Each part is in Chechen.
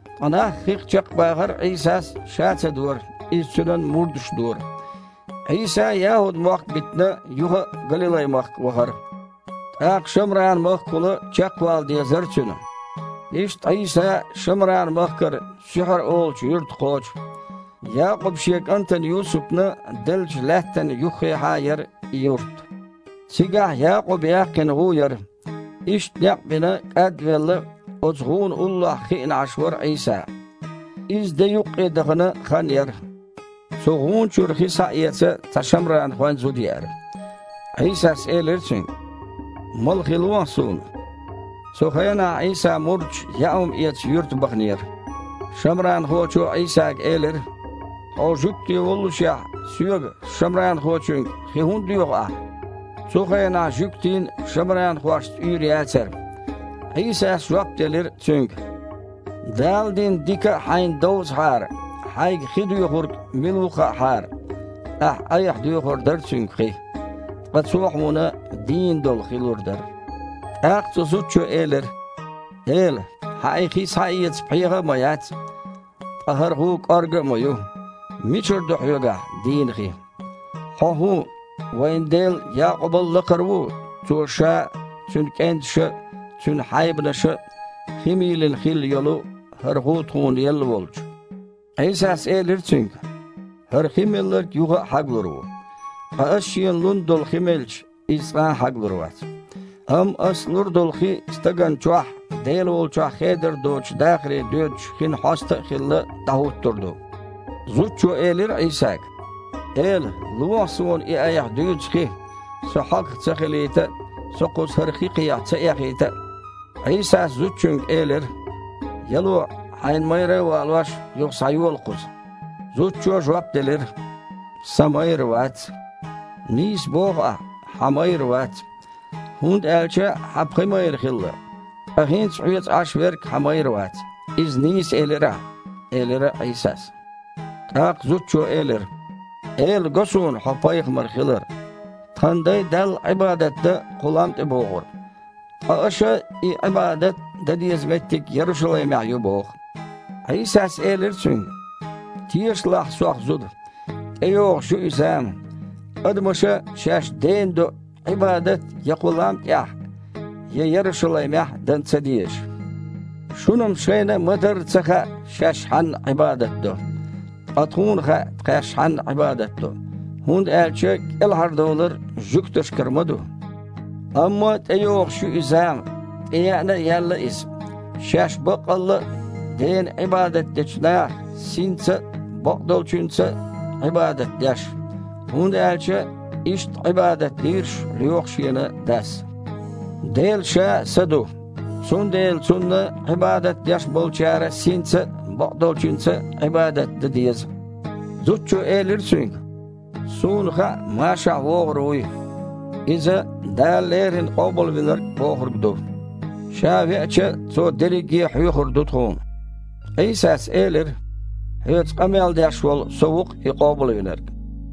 Ткъа нах хих чекхбахар Іийсас Ша ца дора, иза Цуьнан мурдаша дора. Іийса, ЯхІуд-мохк битина, юха а Галилай-махка вахара. ТІаккха Шамран-махкахула чекхвала дезара Цуьнан. Иштта Іийса Шамран-махкара Суьхьар олучу юьрта кхочу. Якъуба шен кІантана Юсупна деллачу лаьттана юххехьа яра и юрт. Цигахь Якъуба яьккхина гІу яра. Иштта, некъ а бина, кІад а велла, оцу гІуна уллохь хиъна Іаш вара Іийса. Иза де юккъе дахана хан яра. Цу гІуна чуьра хи схьаэца цхьа шамранхойн зуда еара. Іийсас элира цуьнга: «Мала хи лохьа Суна». Цу хенахь Іийсан мурдаш яа хІума эца юьрта баханера. Шамранхочо Іийсага элира: «Хьо жуьгти воллушехь, соьга, шамранхочуьнга, хи хІунда доьху Ахь?» (Цу хенахь жуьгтийн шамранхошца уьйр яцара.) Іийсас иштта жоп делира цуьнга: «Дала дина дика а хьайна довзахьара, хьайга хи доьхург мила ву а хаьахьара, ахь-айхьа доьхур дара Цуьнга хи. Ткъа Цо хьуна „дийна долу хи“ лур дара». ТІаккха цу зудчо элира: «Эла, Хьан и хи схьаэца пхьегІа а ма яц, ткъа хІара гІу кІорга а ма ю. Мичара ду Хьоьгахь „дийна хи“? Хьо хІун, вайн дел Якъубал а лакхара ву, цо ша а, цуьнан кІенташа а, цуьнан хьайбанаша а хи мийлина хилла йолу хІара гІу тхуна елла волчу?» Іийсас элира цуьнга: «ХІара хи мелларг юха а хьаглур ву, ткъа Аса шена лун долу хи мелча, иза цкъа а хьаглур вац. Амма Ас лур долу хи стагана чохь, Дела волчохь хедар доцучу дахаре доьдучу хин хьоста а хилла, дІахІуттур ду». Зудчо элира Іийсага: «Эла, лохьа суна и Айхьа дуьйцу хи, со хьогах ца хилийта а, со кхуза хІара хи кхехьа ца эхийта а». Іийсас зудчуьнга элира: «Яло, хьайн майра а валош, юха схьайола кхуза». Зудчо жоп делира: «Сан майра вац». «Нийса боху ахь, хьан майра вац. ХІунда аьлча хьан пхи майра хилла, ткъа хІинца хьоьца Іаш верг хьан майра вац. Иза нийса элира ахьа», – элира Іийсас. ТІаккха зудчо элира: «Эла, го суна Хьо пайхамар хилар. Тхан дай Далла Іибадат дан кху лам тІе богІура, ткъа аша и Іибадат дан деза меттиг Ярушалаймехь ю боху». Іийсас элира цуьнга: «Тешалахь Сох, зуда. ТІейогІуш ю и зама, адамаша шаьш Дена до Іибадат я кху лам тІехь а, я Ярушалаймехь а дан ца дезаш. Шуна-м шайна а ма-дарра ца хаьа, шаьш Хьанна Іибадат до. Ткъа тхуна хаьа тхаьш Хьанна Іибадат до, хІунда аьлча кІелхьардовлар жуьгташкара ма ду. Амма тІейогІуш ю и зама, тІееана а яьлла иза, шаьш баккъалла а Дена Іибадат дечу наха, синца а, бакъдолчуьнца а Іибадат деш. ХІунда аьлча иштта Іибадат дийраш лоьху Шена Дас. Дела Ша а Са ду. Цундела Цунна Іибадат деш болчара синца а, бакъдолчуьнца а Іибадат дан деза». Зудчо элира Цуьнга: «Суна хаьа Машахь вогІур вуй». – (Иза « Дала леррина Къобалвинарг» бохург ду). – «Ша веача, Цо дерриге а хьоьхур ду тхуна». Іийсас элира: «Хьоьца къамел деш волу Со ву-кх И Къобалвинарг».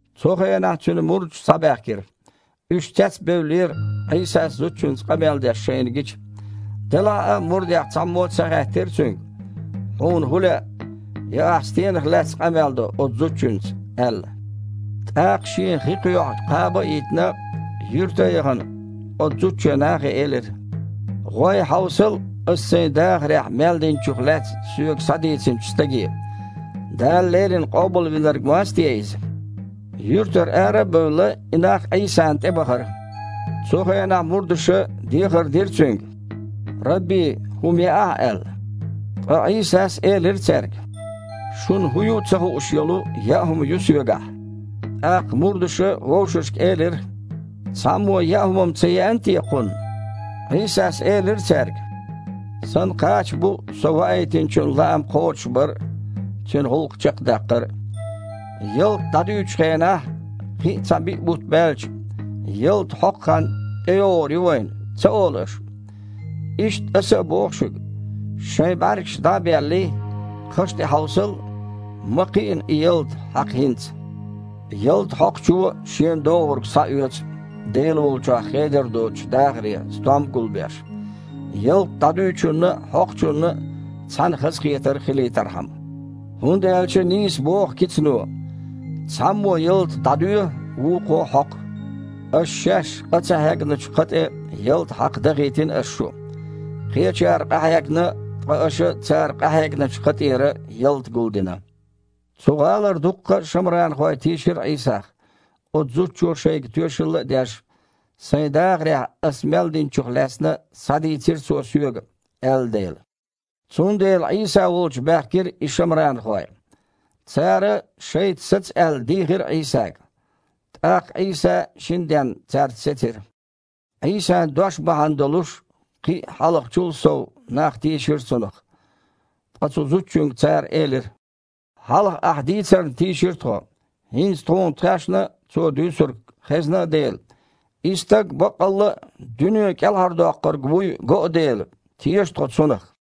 Цу хенахь Цуьнан мурдаш схьабаьхкира. Уьш цецбевллера, Іийсас зудчуьнца къамел деш шайна гича. Делахь а мурдех цхьаммо а ца хаьттира Цуьнга: «Хьуна хІун лаьа?» я: «Ахь стенах лаьцна къамел до оцу зудчуьнца», – аьлла. ТІаккха, шен хи кхоьхьу кхаба а йитина, юьрта а яхана, оцу зудчо нахе элира: «ГІой, хьовсал, ас сайн дахарехь мел динчух лаьцна соьга схьадийцинчу Стаге. Дала леррина Къобалвинарг-м вац те Иза?» Юьртара ара а бевлла, и нах Іийсана тІе бахара. Цу хенахь мурдаша дехар дира Цуьнга: « Рабби, хІума яахьа!» – аьлла. Ткъа Іийсас элира цаьрга: «Шуна хІун ю а ца хууш йолу яа хІума ю Соьгахь». ТІаккха мурдаша вовшашка элира: «Цхьаммо яа хІума-м ца еана те Кхунна?» Іийсас элира цаьрга: «Сан кхача бу Со Ваийтинчун лаам кхочушбар а, Цуьнан гІуллакх чекхдаккхар а. Ялта дІадуьйчу хенахь: „Кхин а цхьа биъ бутт баьлча, ялта хьокху хан тІейогІур ю вайна“, – ца олу аша? Иштта Аса а боху шуьга: шайн бІаьргаш дІа а беллий, кхаш тІе хьовсал, ма кхиъна и ялта хьакха хІинца. Ялта хьокхучо шена догІург схьаоьцу, Дела волчохь хедар доцучу дахаре стом а гулбеш, ялта дІадуьйчунна а, хьокхучунна а цхьаьна хазахетар хилийтархьама. ХІунда аьлча нийса боху кицано: „Цхьаммо ялта дІадоь, вукхо хьокху“. Аша шаьш къа ца хьегначу кха тІе ялта хьакха дахийтина Аса шу. Кхечара къахьегна, ткъа аша цара къахьегначу кха тІера ялта гулдина». Цу гІалара дуккха а шамранхой тийшира Іийсах, оцу зудчо шайга тоьшалла а деш: «Сайн дахарехь ас мел динчух лаьцна схьадийцира Цо соьга», – аьлла дела. Цундела Іийса волчу баьхкира и шамранхой. Цара, шайца саца аьлла, дийхира Іийсага. ТІаккха Іийса шина денна цаьрца сецира. Іийсан дош бахьана долуш кхин а, хьалхачул а сов, нах тийшира Цунах. Ткъа цу зудчуьнга цара элира: «Хьалха ахь дийцарна тийшира тхо. ХІинца тхуна тхаьшна а Цо дуьйцург хезна а дела, и Стаг баккъалла а дуьне кІелхьардоккхург вуй го а дела, теша тхо Цунах».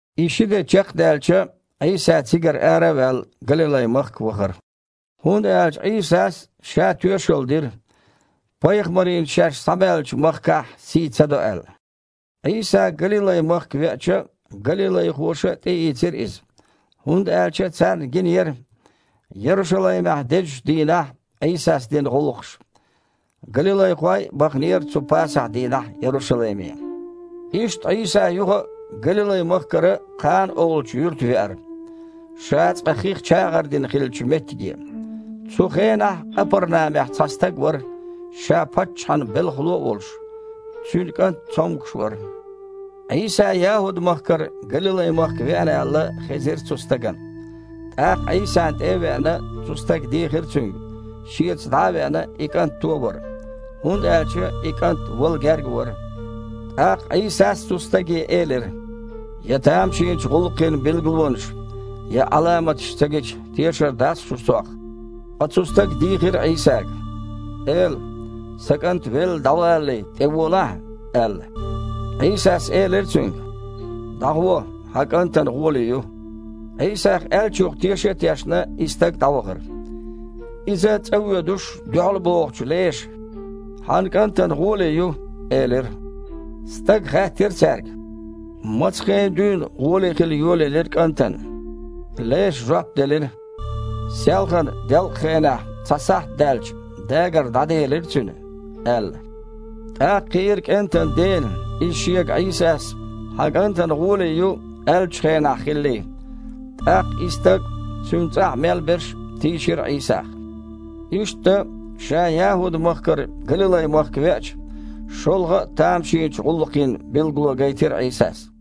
И ши де чекхдаьлча, Іийса, цигара ара а ваьлла, Галилай-махка вахара. ХІунда аьлча Іийсас Ша тоьшалла дира, пайхамарийн шаьш схьабаьллачу махкахь сий ца до аьлла. Іийса Галилай-махка веача, галилайхоша а тІеийцира Иза. ХІунда аьлча царна гинера Ярушалаймехь дезачу дийнахь Іийсас дина гІуллакхаш. Галилайхой а баханера цу Пасахь-дийнахь Ярушалайме. Иштта Іийса юха а Галилай-махкара Кхана олучу юьрта веара, Ша цкъа хих чагІар дина хиллачу меттиге. Цу хенахь Къапарнамехь цхьа стаг вара, ша паччахьан белхало а волуш. Цуьнан кІант цомгуш вара. Іийса ЯхІуд-махкара Галилай-махка веана аьлла, хезира цу стагана. ТІаккха, Іийсана тІе а веана, цу стага дийхира Цуьнга, шеца дІа а веана, и кІант туовар. ХІунда аьлча и кІант вала герга вара. ТІаккха Іийсас цу стаге элира: «Я тамашийначу гІуллакхийн билгалонаш, я Іаламаташ ца гича, тешар дац-кх шу Сох». Ткъа цу стага дийхира Іийсага: «Эла, сан кІант велла дІавалале, тІеволахьа!» – аьлла. Іийсас элира цуьнга: «ДІагІо, хьан кІантана гІоле ю». Іийсас аьллачух теша а тешна, и стаг дІавахара. Иза цІа воьдуш, дуьхьалбогІучу леша: «Хьан кІантана гІоле ю», – элира. Стага хаьттира цаьрга: «Маца хена дуьйна гІоле хила йолаелира кІантана?» Леша жоп делира: «Селхана, делкъахенахь, цхьа сахьт даьлча, дагар дІаделира цуьнан», – аьлла. ТІаккха хиира кІентан дена, иза шега Іийсас: «Хьан кІантана гІоле ю», – аьллачу хенахь хиллий. ТІаккха и стаг а, цуьнан цІахь мел берш а тийшира Іийсах. Иштта, Ша ЯхІуд-махкара Галилай-махка веача, шолгІа а тамашийначу гІуллакхийн билгало гайтира Іийсас.